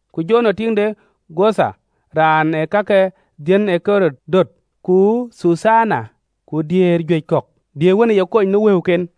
ku Jowana tiiŋ de Cudha raan ë ka ke dhiën ë Ɣerod döt, ku Thuthana, ku diëër juëc kɔ̈k, diëër wën ë ye kony në wëuken.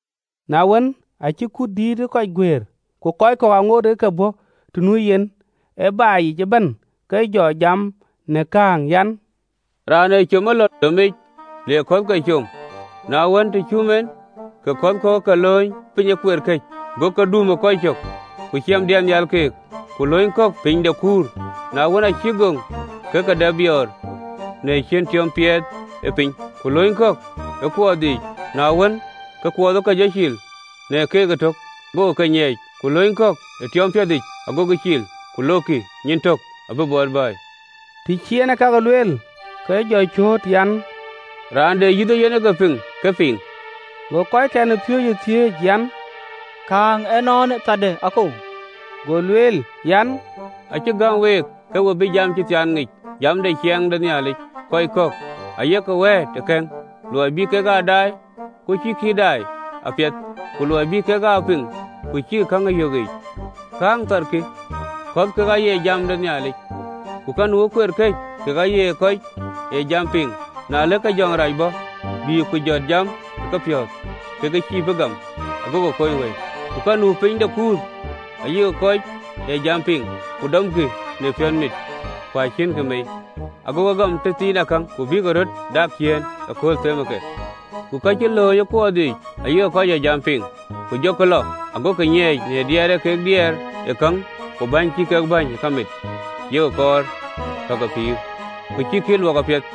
Na wën, aacï kut dïït ë kɔc guëër, kɔc kɔ̈k aŋootkï ke ke bɔ̈ të nu yen ë baai yic ëbɛ̈n, ke jɔ jam në kääŋ an: “Raan ee com ë lɔ domic le kɔ̈thke com: na wën, të cum en, ke kɔ̈k ke ke lööny piny ë kueer këc, go ke dum ë kɔc cök, ku cam diɛt nhial keek. Ku lööny kɔ̈k piny de kuur, na wën, aa cïk goŋ, ke ke dap biɔɔr, në ciën tiɔp tiɔɔp ë piny. Ku lööny kɔ̈k ë kuɔɔth yiic, na wën, ke kuɔɔth ë ke jɔ cil në keek ëtök, gokï ke nyiɛɛc. Ku lööny kɔ̈k ë tiɔɔm piɛthic, agokï cil, ku lokkï, nyin tök abï bɔt bɛ̈ɛ̈i.” Të cï en ëkakë lueel, ke jɔ cööt an, “Raan de yïth ee yen ke piŋ, ke pïŋ!” Go kɔckɛn ë piööcë thiëëc an, kääŋë ënɔɔnë, tharde akou? (LXX). Go lueel an, “Acï gäm week ke we bï jam cï thiaan ŋic, jam de ciɛɛŋ de Nhialic: kɔc kɔ̈k aye ke wɛ̈ɛ̈t ë kɛ̈ŋ, luɔi bï kek aa daai, ku cïkï ë daai apiɛth, ku luɔi bï kek aa piŋ, ku cïkï käŋ ë yök yiic. “Kääŋ thar kï: Kɔ̈th kek aye jam ë Nhialic. Ka nu ë kueer këc kek aye kɔc ee jam piŋ, na ëlë ke jɔŋdït rac bɔ̈, bïï ku jɔt jam ë kepiɔ̈ɔ̈th, ke ke cïï bï gam ago ke kony wëi. Ku ka nu piny de kuur, ayek kɔc ee jam piŋ, ku dɔmkï në piɔ̈nmit: ku acïnkï mei, agokï gam tëthiinakäŋ, ku bïk röt dak ciëën ëkööl themë ke. Ku ka cï lööny ë kuɔɔth yiic ayek kɔc ee jam piŋ, ku jɔkï lɔ, ago ke nyiɛɛc në diɛɛr ee kek diɛɛr ë käŋ ku bäny cï kek bäny ku kamit yek kɔɔr ka ke pïïrë, ku cïkï ee luɔk apiɛth.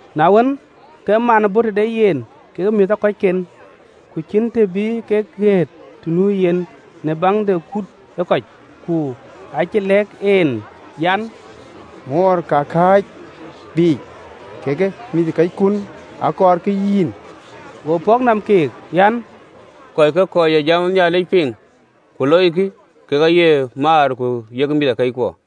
Na wën, ke man bɔ̈ tëde yen kekë mïthëkɔcken, ku cïn të bï kek ɣeet të nu yen në baŋ de kut ë kɔc. Ku acï lɛ̈k en an, “Moor ka kääc biicë kekë mïthëkɔckun, akɔɔrkï yïn.” Go pɔ̈k nɔm keek an, “Kɔckë kɔc ee jam ë Nhialic piŋ, ku loikï kek aye maar ku mïthëkɔckuɔ.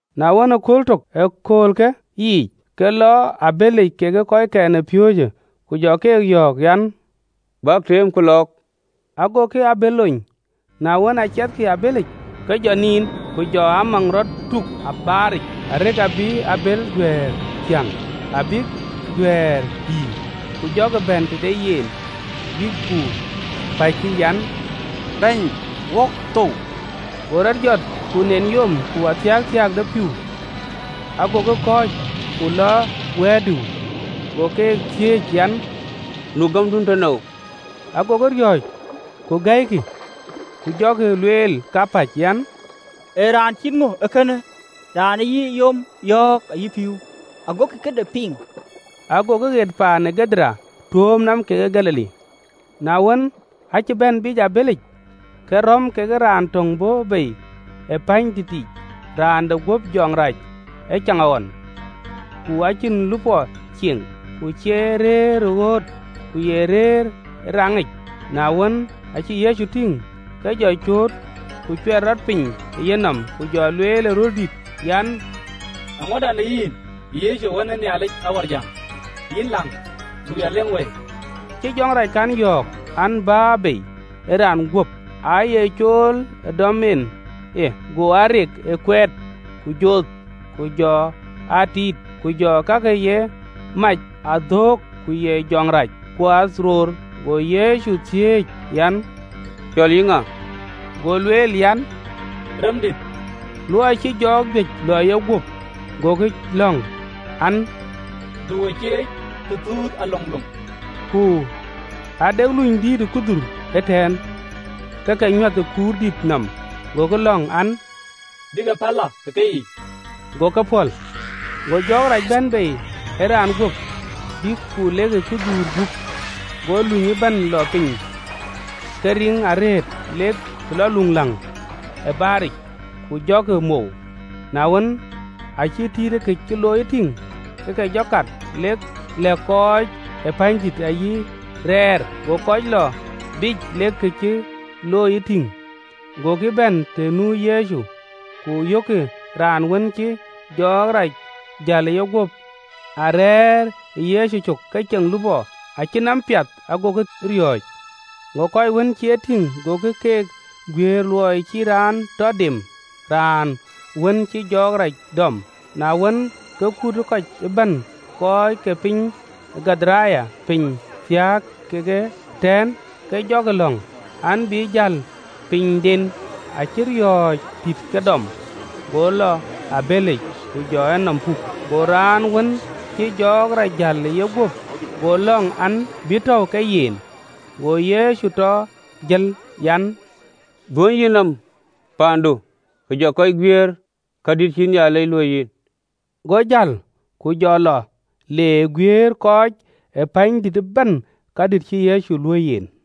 Na wën, ë kööl tök ë aköölkë yiic, ke lɔ ë abëlic kekë kɔckɛn ë piööcë, ku jɔ keek yɔ̈ɔ̈k an, “Bäk teemku lɔɔk.” Agokï abël lony. Na wën, aa ciɛthkï ë abëlic, ke jɔ niin: ku jɔ amaŋ rɔt tuk ë baaric, arëk abï abël duɛ̈ɛ̈r thiäŋ, abïk duɛ̈ɛ̈r dïïr. Ku jɔkï bɛ̈n tëde yen, bïk ku päckï an, “Bɛ̈ny, wok thou!” Go rɔt jɔt, ku nen yom ku athiakthiak de pïïu, agokï kɔ̈ɔ̈c, ku lɔ wɛ̈ɛ̈r dïu. Go ke thiëëc an, “Nu gämdun tënou?” Agokï riɔ̈ɔ̈c, ku gɛ̈ikï, ku jɔkï lueel kapäc an, “Ee raan cït ŋö ee kënë? Raan ee yï yom yɔ̈ɔ̈k ayï pïïu, agokï këde piŋ!” Agokï ɣet paan de kɔc ke Gadaren, tuööm nɔm kekë Galili. Na wën, aacï bɛ̈n biic ë abëlic, ke räm ke raan töŋ bɔ̈ bei ë pänydïtic, raan de guöp jɔɔk rac ë caŋɣɔn, ku acïn lupɔ ee cieŋ, ku cie rëër ɣööt, ku ye rëër ë rɛ̈ŋ yiic. Na wën, aacï Yecu tïŋ, ke jɔ cööt, ku cuɛt rɔt piny ë yenɔm, ku jɔ lueel ë röl dït an, “Eeŋöda në yïn, Yecu, Wën ë Nhialic Awärjäŋ? Yïn läŋ, du ya leŋ wëi!” Acï jɔŋ rac kɔn yɔ̈ɔ̈k an, Bä bei ë raan guöp. Aa ye cool ë dɔm en e: go aa rek kuɛɛt ku joth, ku jɔ aa tiit, ku jɔ ka ye ke yen mac aa dhoŋ, ku ye jɔŋ rac thɛl ë jɔ̈ɔ̈ric. Go Yecu thiëëc an, “Cɔl yïn ŋa?” Go lueel an, “Remdït,” në luɔi cï jɔɔk juëc lɔ ë yeguöp. Gokï lɔ̈ŋ an, du wo cieec tëthuth a loŋloŋ. Ku ade lunydïït ë kudhuur ëtɛ̈ɛ̈n, aake nyuäth ë kuurdït nɔm: gokï lɔ̈ŋ an, bï ke päl lɔ ë ke yiic. Go ke pɔ̈l. Go jɔɔk rac bɛ̈n bei ë raan guöp, bïk ku lekï ë kudhuur gup: go luny ëbɛ̈n lɔ piny ë ke riŋ arëët të lɔ luööŋläŋ ë baaric, ku jɔkï mou. Na wën, aacï kɔc ee tïït kë cï looi tïŋ, ke ke jɔ kat, lek lɛ̈k kɔc ë pänydïït ayï rɛɛr. Go kɔc lɔ biic lek ke cï looi tïŋ, gokï bɛ̈n të nu Yecu, ku yökkï raan wën cï jɔɔk rac jäl ë yeguöp, arɛ̈ɛ̈r ë Yecu cök, ke ceŋ lupɔ, acï nɔm piath, agokï riɔ̈ɔ̈c. Go kɔc wën cï e tïŋ, gokï keek guiëër luɔi cï raan tɔ dem raan wën cïï jɔɔk rac dɔm. Na wën, ke kut ë kɔc ëbɛ̈n kɔc ke piny de Gadaren, piny thiääk kekë tɛ̈ɛ̈n, ke jɔkï lɔ̈ŋ an, bï jäl pinyden, acï riɔ̈ɔ̈c dït ke dɔm: go lɔ ë abëlic, ku jɔ enɔm puk. Go raan wën cï jɔɔk rac jäl ë yeguöp go lɔ̈ŋ an, “Tɔ ya lɔ wo week.” Go Yecu tɔ jël an: “Dhuönyë yïnɔm paandu, ku jɔ kɔc guiëër kadït cïï Nhialic luöi yïn.” Go jäl, ku jɔ lɔ le guiëër kɔc ë pänydïït ëbɛ̈n kadït cïï Yecu luöi yen.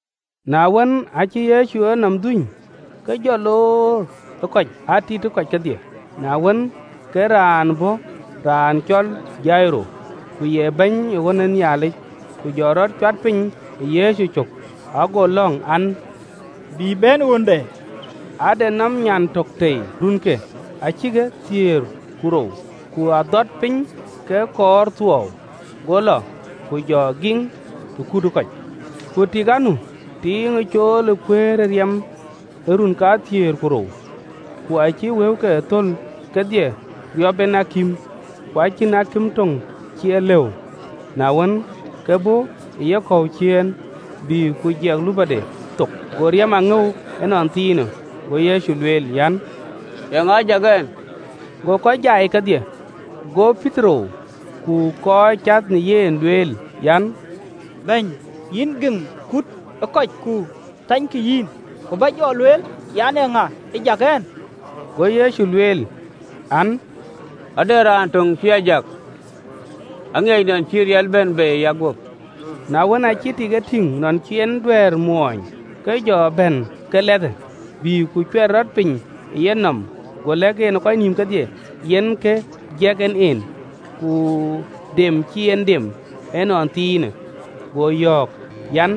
Na wën, aacï Yecu enɔm dhuny, ke jɔ loor ë kɔc, aa tiit kɔc kedhie. Na wën, ke raan bɔ̈ raan cɔl Jairo, ku ye bɛ̈ny ë ɣön ë Nhialic: ku jɔ rɔt cuat piny ë Yecu cök, ago lɔ̈ŋ an, bï bɛ̈n ɣönde, ade nɔm nyan tök tei, runke acïtkï thiëër ku rou, ku adhɔt piny ke kɔɔr thuɔɔu. Go lɔ, ku jɔ giŋ ë kut ë kɔc. Ku tik anu, tiiŋ ë cool ë kuëër ë riɛm ë run kathiëër ku rou, ku acï wëuke thöl kedhie riɔp en akïm, ku acïn akïm töŋ cï e lëu. Na wën, ke bɔ̈ ë yekɔ̈u ciëën, bï ku jɛk lupɔde thok: go riɛm a ŋëu ënɔnthiinë. Go Yecu lueel an, “Eeŋa ë jak ɛn?” Go kɔc jai kedhie, go Petero ku kɔc cath në yen lueel an: “Bɛ̈ny, yïn giŋ kuut ë kɔc ku thanykï yïn, ku bä jɔ lueel an, Eeŋa ë jak ɛn?” Go Yecu lueel an, “Ade raan töŋ cï a jak: aŋiɛc nɔn cï ë riɛl bɛ̈n bei ë yeguöp.” Na wën, aacï tik e tïŋ nɔn cïï en duëër mɔɔny, ke jɔ bɛ̈n ke lɛthë, bï ku cuɛt rɔt piny ë yenɔm, go lɛ̈k en ë kɔc nïïm kedhie yen kë jiɛk en en, ku dem cï en dem ënɔnthiinë. Go yɔ̈ɔ̈k an,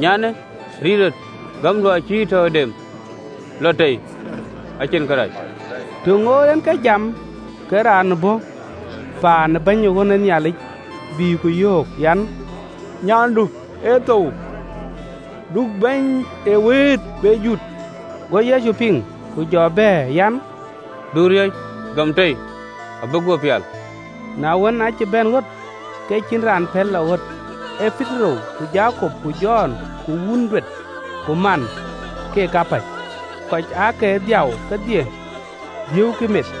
“Nyandï, rit rɔt: gämdu acï yï tɔ dem, acïn kërac.” Të ŋoot en ke jam, ke raan bɔ̈ paan ë bɛ̈ny ë ɣön ë Nhialic, bï ku yöök an, “Nyandu ë thou, du Bɛ̈ny ee wëët be jut.” Go Yecu piŋ, ku jɔ bɛ̈ɛ̈r an, “Du riɔ̈c: gam tei, acï guöp pial.” Na wën, aacï bɛ̈n ɣöt, ke cïn raan pɛ̈l lɔ ɣöt, ee Petero, ku Jakop, ku Jɔn, ku wun duet ku man, keek kapäc. Kɔc aake dhiau kedhie, dhiëëukï meth,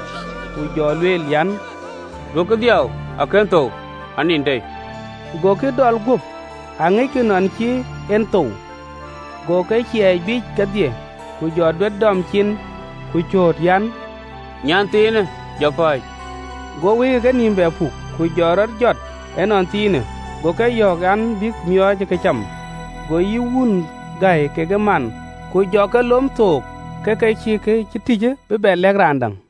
ku jɔ lueel an, “Duökï dhiau, akën thou, anin tei!” Gokï dɔl guöp, aŋickï nɔn cï en thou. Go ke ciɛɛc biic kedhie, ku jɔ duet dɔm cin, ku cööt an, “Nyanthiinë, jɔ pääc.” Go wëike kenïïm bɛ puk, ku jɔt rɔt ënɔnthiinë: go ke yɔ̈ɔ̈k an, bïk miɔɔc ë këcam. Go yï wun gäi kekë man: ku jɔ ke lom thook, ke ke cïï kë cï tïc bï lɛ̈k raan däŋ.